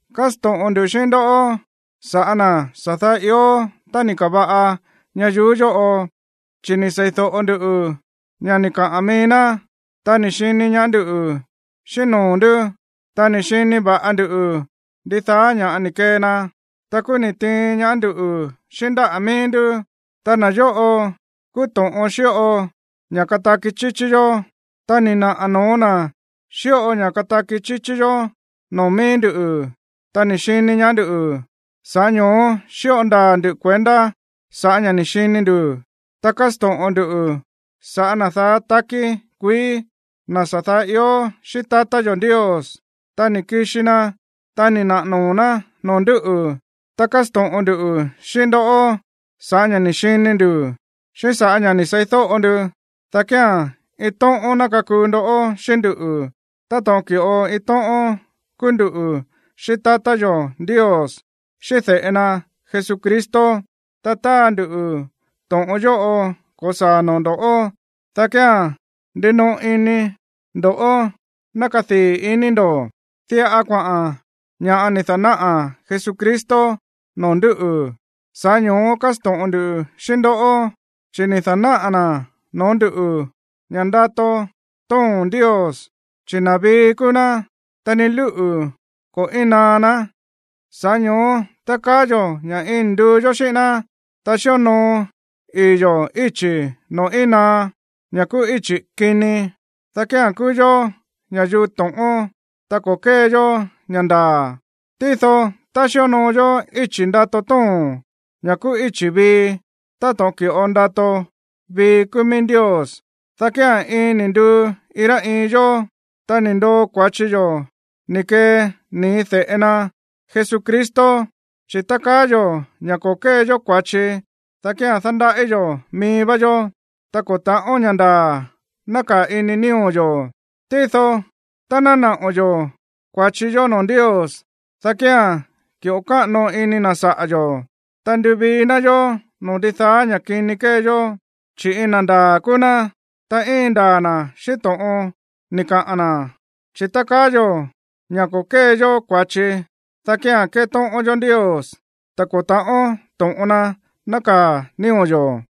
Kásto̱ꞌon nduꞌu̱ xíꞌín ndoꞌó sa̱ꞌá na̱ sa̱ daá ió tá ni̱ ka̱va̱ꞌa ñayuú yóꞌo. Chi̱ ni̱ seídóꞌo ndu ña̱ ni̱ kaꞌa̱n mií ná, ta ni̱ xini ñaá ndú xíꞌín noo̱ ndú, ta ni̱ xini va̱ꞌa ndu ndidaá ña̱ ni̱ kee na, ta kúú ni̱ tiin ñaá ndú xíꞌín ndáꞌa̱ mií ndú. Ta na̱ yóꞌo kúú to̱ꞌon xíꞌo ña̱ kataki chíchí yó. Ta ni̱ naꞌa̱ no̱ó na̱ xíꞌo ña̱ kataki chíchí yó noo̱ mií ndú, ta ni̱ xini ñaá ndú. Sa̱ꞌá ño̱ó xíꞌo ndaa̱ ndu̱ kuendá sa̱ꞌá ña̱ ni̱ xini ndu̱, ta kásto̱ꞌon ndu sa̱ꞌá na̱ daá takí kuií, na̱ sa̱ daá ió xíꞌín tatá yo̱ Ndios. Ta ni̱ kixi na, ta ni̱ naꞌa̱ noo̱ ná noo̱ ndú. Ta kásto̱ꞌon ndu xíꞌín ndó sa̱ꞌá ña̱ ni̱ xini ndu̱, xíꞌín sa̱ꞌá ña̱ ni̱ seídóꞌo ndu, dá kía̱n iin tóꞌón ná kakuu ndó xíꞌín nduꞌu̱, táto̱ꞌon ki̱ꞌo iin tóꞌón kúú nduꞌu̱ xíꞌín tatá yo̱ Ndios, xíꞌín de̱ꞌe na Jesucristo. Ta táa ndu to̱ꞌon yóꞌo ko̱saa̱ noo̱ ndo̱ꞌó, dá kía̱n ndinoꞌo ini ndo̱ ná kadii̱ ini ndo̱. Diꞌa kuaꞌa̱n ña̱ ni̱ da̱náꞌa̱ Jesucristo noo̱ ndúꞌu̱, sa̱ꞌá ño̱ó kásto̱ꞌon ndu xíꞌín ndó. Chi̱ ni̱ da̱náꞌa̱ na̱ noo̱ ndú ña̱ ndato tóo̱n Ndios, chi̱ na̱ vii kúú ná, ta ni lúꞌu̱ ko̱ íin naá ná. Sa̱ꞌá ño̱ó tá kaá yo̱ ña̱ iin ni̱ nduu yó xíꞌín ná, ta xíonoo ii̱ yo̱ íchi̱ noo̱ íin naá, ña̱ kúú íchi̱ kini, dá kía̱n kúú yó ña̱yuu to̱ꞌón, ta ko̱ kée yó ña̱ ndaa̱. Tído tá xíonoo yó íchi̱ ndato tóo̱n, ña̱ kúú íchi̱ vii, táto̱ꞌon ki̱ꞌo ndato vii kúú mií Ndios, dá kía̱n iin ni̱ nduu iin rá iin yó, ta ni̱ ndoo kua̱chi yó ni̱ kee nii̱ de̱ꞌe na Jesucristo. Chi̱ tá kaá yo̱ ña̱ ko̱ kée yó kua̱chi, dá kía̱n dándaꞌí yo̱ mií vá yó, ta ko̱ ta̱ꞌón ña̱ ndaa̱ nákaa̱ ini nío̱ yo̱. Tído tá ná naꞌo̱ yo̱ kua̱chi yó noo̱ Ndios, dá kía̱n ki̱ꞌo káꞌano ini na̱ saꞌa̱ yo̱, ta nduvii ná yó noo̱ ndidaá ña̱ kini kée yó, chi̱ iin na̱ ndaa̱ kúú ná, ta íin ndaa̱ na̱ xíꞌín to̱ꞌon ni̱ kaꞌa̱n na̱. Chi̱ tá kaá yo̱ ña̱ ko̱ kée yó kua̱chi, dá kía̱n ketóꞌón yó Ndios, ta ko̱ ta̱ꞌón to̱ꞌon na nákaa̱ nío̱ yo̱.